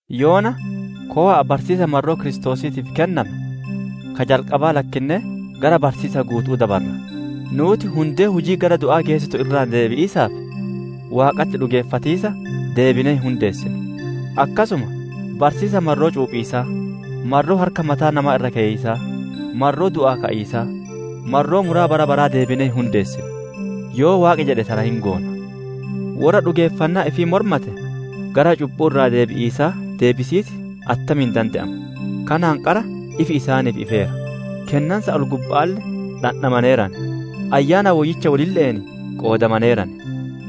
Yoona kowa'a barsiisa marroo Kiristoosiitiif kenname, ka jalqabaa lakkinnee gara barsiisa guutu'uu dabarra. Nuuti hundee hujii gara du'aa geessitu irraa deebi'iisaatii fi Waaqatti dhugeeffatiisaa, deebinee hin hundeessinu. Akkasuma barsiisa marroo cuuphiisaa, marroo harka mataa namaa irra keyiisaa, marroo du'aa ka'iisaa, marroo muraa bara baraa deebinee hin hundeessinu. Yoo Waaqi jedhe tana hin goona. Worra dhugeeffannaa ifii mormate gara cubbuu irraa deebi'iisaa deebisiis attamiin dande'ama? Kanaan qaraa ifi isaaniif ifeera; kennansa ol-gubba'aalle dhandhamaneeran; Ayyaana Woyyicha wolille'een qoodamaneeran.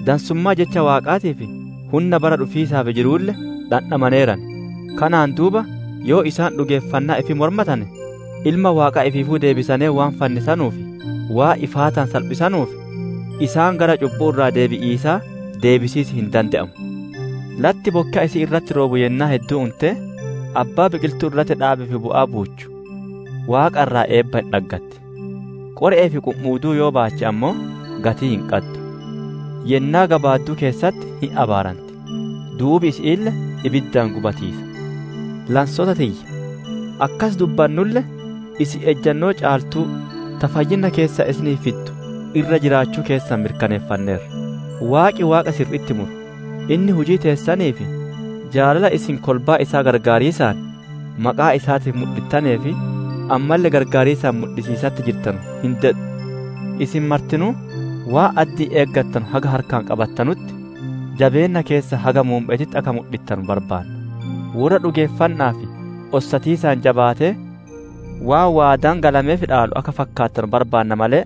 Dansummaa jecha Waaqaatii fi hunna bara dhufiisaaf jiruulle dhandhamaneeran. Kanaan duuba yoo isaan dhugeeffannaa ifii mormatane, Ilma Waaqaa ifiifuu deebisanee waan fannisanuu fi waan ifaataan salphisanuuf, isaan gara cubbuu irraa deebi'iisaa deebisiis hin dande'amu. Latti bokkeya isii irratti roobu yennaa hedduu untee, abbaa biqiltuu irratti dhaabeef bu'aa buuchu Waaqa irraa eebba hin dhaggatti. Qore'ee fi qumi'uuduu yoo baache ammoo, gatii hin qaddu; yennaa gabaadduu keessatti hin abaaranti; duubi isi'iille ibiddaan gubatiisa. Lansoota tiyya akkas dubbannulle, isin ejjannoo caaltuu ta fayyinna keessan isiniif fiddu irra jiraachuu keessan mirkaneeffanneerra. Waaqi Waaqa sirri'itti muru; inni hujii teessanii fi jaalala isin kolbaa isaa gargaariisaan maqaa isaatiif mudhittanee fi ammalle gargaariisaan mudhisiisatti jirtanu hin dedhu. Isin martinuu waan addi'iin eeggattanu haga harkaan qabattanutti, jabeenna keessan haga muumme'eetitti akka mudhittanu barbaanna. Worra dhugeeffanna'aa fi ossatiisaan jabaatee, waan waadaan galameef dhaalu akka fakkaattanu barbaanna malee,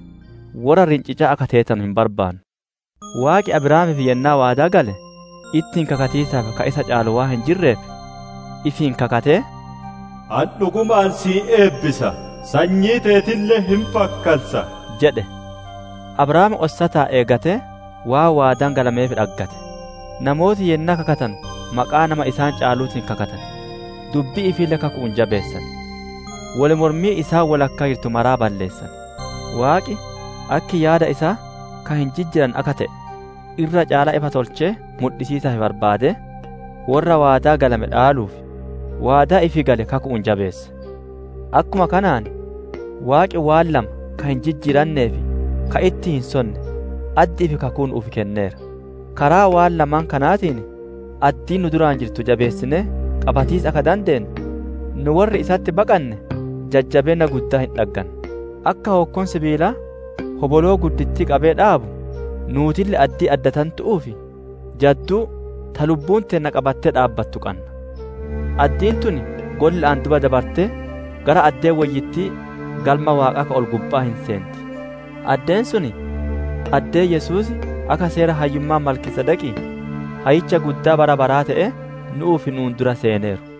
worra rincicaa akka teetanu hin barbaannu. Waaqi, Abrahaamiif yennaa waadaa gale, ittiin kakatiisaaf ka isa caalu waan hin jirreef, ifiin kakatee, «Ani dhugumaan si hin eebbisa, sanyii teetille hin fakkansa» jedhe. Abrahaam ossataan eeggatee waan waadaan galameef dhaggate. Namooti yennaa kakatanu maqaa nama isaan caaluutiin kakatan; dubbii ifiille kaku'uun jabeessiisaan, wol mormii isaan wodhakkaa jirtu maraa balleessan. Waaqi akki yaada isaa ka hin jijjiiranne akka te'e irra caalaa ifa tolchee mudhisiisaaf barbaadee, worra waadaa galame dhaaluuf, waadaa ifii gale kaku'uun jabeesse. Akkuma kanaan Waaqi waan lama ka hin jijjiirannee fi ka ittiin hin sonne addi'ii fi kakuu nu'uuf kenneera; karaa waan lama kanaatiin addii nu dura jirtu jabeessinee qabatiisa akka dandeennu, nu worri isatti baqanne jajjabeenna guddaa hin dhagganna. Akka hookkoon sibiilaa, hoboloo guddittii qabee dhaabu, nuutille addii addatantu'uu fi jadduu ta lubbuun teenna qabattee dhaabbattu qanna; addiin tun golla'aan duuba dabartee gara addee woyyittii Galma Waaqaa ka ol-gubba'aa hin seenti. Addeen sun addee Yesuus akka seera hayyummaa Malkiisedeqii, Hayyicha Guddaa bara baraa te'ee, nu'uuf nu'uun dura seeneeru.